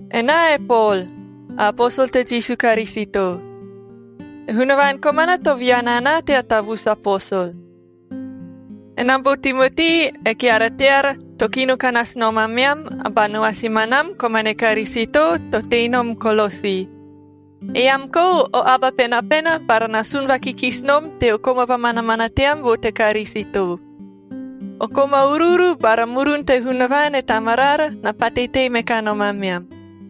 Enaa e Pol, a aposol te Jisu Karisito. E Hunavaan komana to viana anaa tea tavusu aposol. Enam bo Timoti, e keara teara, to kino ka nasu nom ameam, a ba noasi manam komane Karisito to tei nom Kolosi. Eam kou o aba penapena bara na sun vakikisi nom teo koma vamanamana team vo te Karisito. O koma uruuru bara murun te Hunavaan e Tamaraara na pate tei me kanom ameam.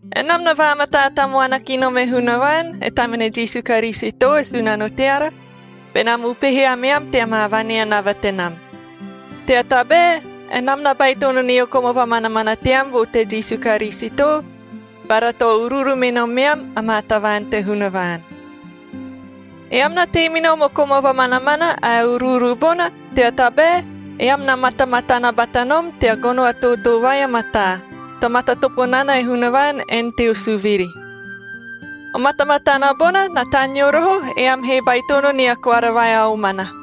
Enam na vaamataa tamuana ki nom e Hunavaan, e tamane Jisu Karisito, e Sunano teara, benam upehe ameam tea maa vaneanava tenam, tea tabae enam na baitono nio koma vamanamana team vo te Jisu Karisito bara to uruuru me nomeam amaa tavaan te Hunavaan. Eam na tei me nom o koma vamanamana ae uruuru bona, tea tabae eam na matamatana bata nom tea gono a tootoo vai a mataa, to matatopo nana e Hunavaan en teo suviri. O matamatana bona na taneo roho, eam he baitono nia koara vai a omana,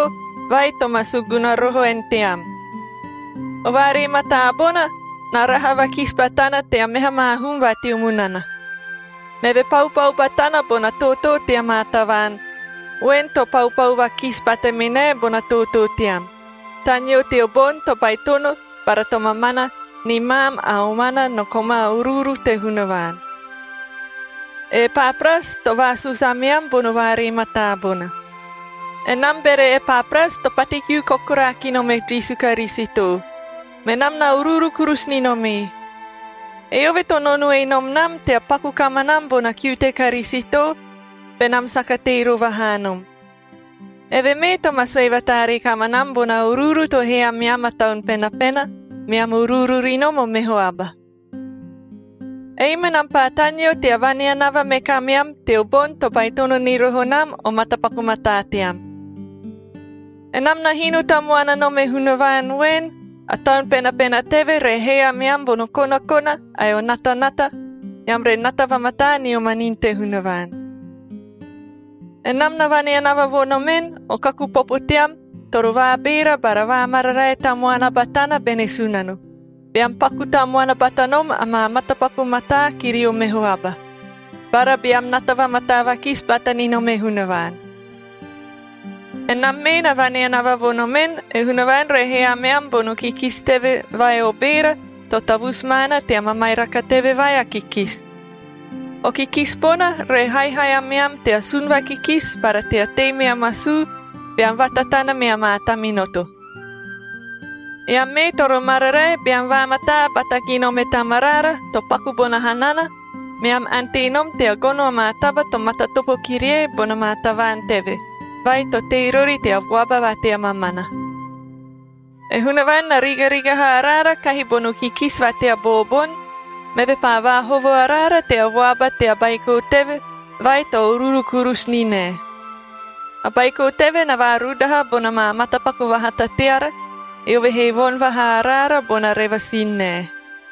vai to ma suguna roho en team. O vaaree mataa bona na raha vakisi batana tea meha maa hum va teo munana. Meve paupau batana bona tootoo tea maa tavaan voen, to paupau vakisi bata me nae bona tootoo team, taneo teo boni to baitono bara to mamana ni maam a omana no koma uruuru te Hunavaan. E Epapras to vaasusu ameam bono vaaree mataa bona. Enam bere Epapras to pate kiu kokoraa ki nom e Jisu Karisito, menam na uruuru kurusu ni nom ee. Eove to nonoe nom nam tea paku kamanam bona kiu te Karisito benam saka tei rova haa nom. Eve mee to ma sue vataaree kamanam bona uruuru to hee ameam a Taun Penapena, meam uruuru ri nom o meho aba. Ei menam paa taneo tea vaneanava me kameam teo boni to baitono ni roho nam o matapaku mataa team. Enam na hino tamuana nom e Hunavaan voen, a Taun Penapena teve re hee ameam bono konakona ae o natanata, eam re nata vamataa nio manini te Hunavaan. Enam na vaneanava vo nomen, o kaku popo team toro vaabeera bara vaamararae tamuana batana bene Sunano, beam paku tamuana bata nom amaa matapaku mataa kirio meho aba, bara beam nata vamataa vakisi bata ni nom e Hunavaan. Enam mee na vaneanava vo nomen, e Hunavaan re hee ameam bono kikisi teve vai o beera, to tavusu maana tea mamairaka teve vai a kikisi. O kikisi bona re haihai ameam tea sun vakikisi bara tea tei mea masuu beam vatatana mea maa taminoto. Eam mee toro mararae, beam vaamataa bata ki nom e Tamaraara, to paku bona hanana, meam ante nom tea gono amaa taba to matatopo kirie bona maa tavaan teve, vai to tei rori tea vuaba va tea mamana. E Hunavaan na rigarigaha araara kahi bono kikisi va tea booboni, meve paa vaahovo araara tea vuaba tea Baiko teve, vai to uruuru kurusu ni nae. A Baiko teve na vaarudaha bona maa matapaku vahata teara, eove he voni vahaa araara bona revasin nae.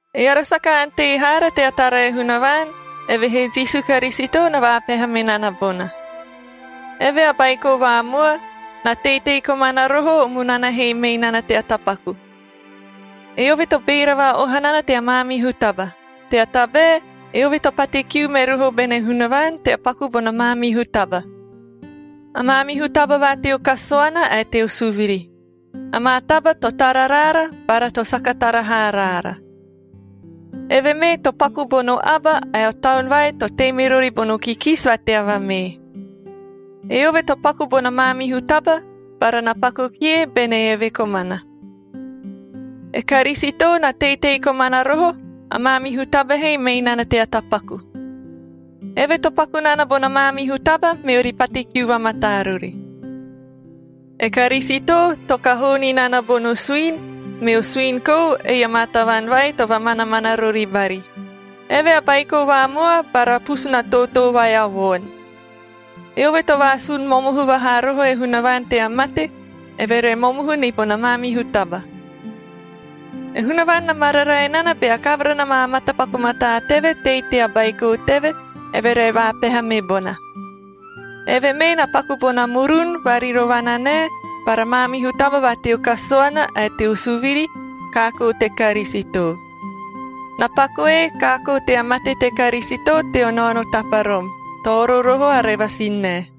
Eara saka ante haara tea tara e Hunavaan, evehee Jisu Karisito na vaapeha me nana bona. Eve a Baiko vaamua, na teitei komana roho o munana he mei nana tea tapaku. Eove to beera va-oha nana tea maamihu taba, tea tabae eove to pate kiu me roho bene Hunavaan tea paku bona maamihu taba – a maamihu taba va teo kasuana ae teo suviri, amaa taba to tara raara bara to saka tara haa raara. Eve mee to paku bono aba ae o taun vai to tei me rori bono kikisi va tea vamee. Eove to paku bona maamihu taba, bara na paku kie bene eve komana. E Karisito na teitei komana roho a maamihu taba he mei nana tea tapaku. Eve to paku nana bona maamihu taba, meori pate kiu vamataa rori. E Karisito to kahoo ni nana bono suini, meo suini kou, ei amaa tavaan vai to vamanamana rori bari. Eve a Baiko vaamua bara pusuna tootoo vai a voon. Eove to vaasun momohu vaha roho e Hunavaan tea mate, eve re momohu ni bona maamihu taba. E Hunavaan na mararae nana bea kavara na maa matapaku mataa teve tei tea Baiko teve, eve re vaapeha me bona. Eve mee na paku bona murun varirovana nae bara maamihu taba va teo kasuana ae teo suviri kaakoo te Karisito. Na pakue kaakoo tea mate te Karisito teo naono taparom, to oro roho a revasin nae.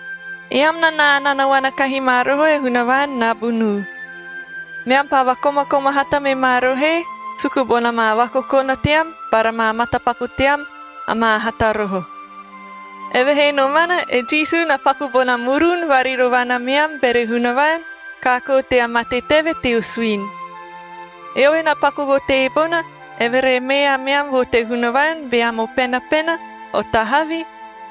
Eam na naananaona kahi ma roho e Hunavaan nabunuu. Meam paa vakomakoma hata me ma rohoe suku bona maa vakokona team bara maa matapaku team amaa hata roho. Evehee nomana e Jisu na paku bona murun varirovana meam bere Hunavaan, kaakoo tea mate teve teo suini. Eove na paku vo teebona, eve re mee ameam vo te Hunavaan beam o penapena, o tahavi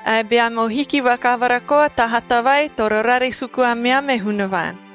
ae beam o hiki vakavara koa ta hata vai toro rare suku ameam e Hunavaan.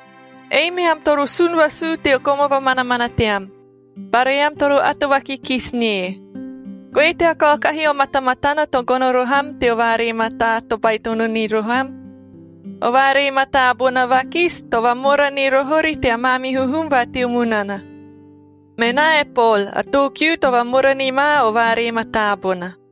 Ei meam toro sun vasuu teo koma vamanamana team, bara eam toro ato vakikisi nie. Goe tea kaokahi o matamatana to gono roho am teo vaaree mataa to baitono ni roho am. O vaaree mataa bona vakisi, to vamora ni roho ori tea maamihu hum va teo munana. Menaa e Pol, a too kiu to vamora ni ma o vaaree mataa bona.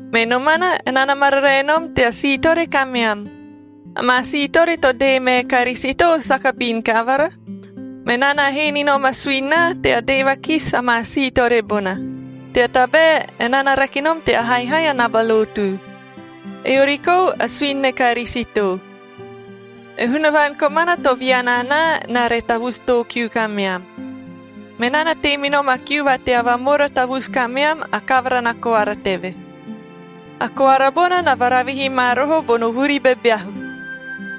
Me nomana, enaa na mararae nom tea siitore kameam. Amaa siitore to dee mae Karisito saka bin kavara. Menaa na hee ni nom a suini naa tea dee vakisi amaa siitore bona, tea tabae enaa na rake nom tea haihai a naba lotu. Eori kou a suini ne Karisito. E Hunavaan komana to viana anaa, enaa re tavusu too kiu kameam. Menaa na tei me nom a kiu va tea vamora tavusu kameam a kavara na koara teve. A koara bona na varavihi ma roho bono vuri bebeahu,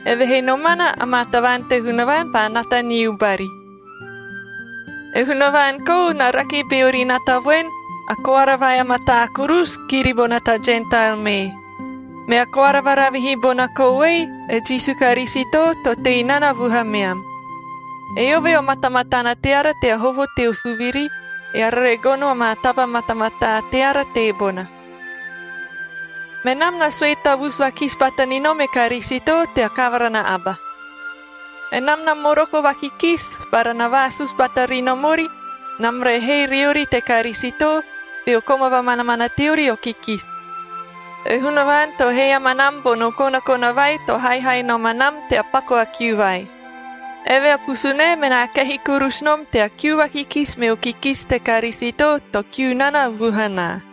evehee nomana amaa tavaan te Hunavaan paa nata niu bari. E Hunavaan kou na rake beori nata voen, a koara vai a mataa kurusu, kiri bona ta Jentael mee. Mea koara varavihi bona kou ei, e Jisu Karisito to tei nana vuhameam. Eove o matamatana teara tea hovo teo suviri, eara re gono amaa taba matamataa teara teebona. Menam na sue tavusu vakisi bata ni nom e Karisito tea kavara na aba. Enam na moroko vakikisi bara na vaasusu bata ri nom ori, enam re hee riori te Karisito, beo koma vamanamana teori o kikisi. E Hunavaan to hee amanam bono konakona vai to haihai nom anam tea paku a kiu vai. Eve a pusunae menaa kehi kurusu nom tea kiu vakikisi meo kikisi te Karisito to kiu nana vuhanaa.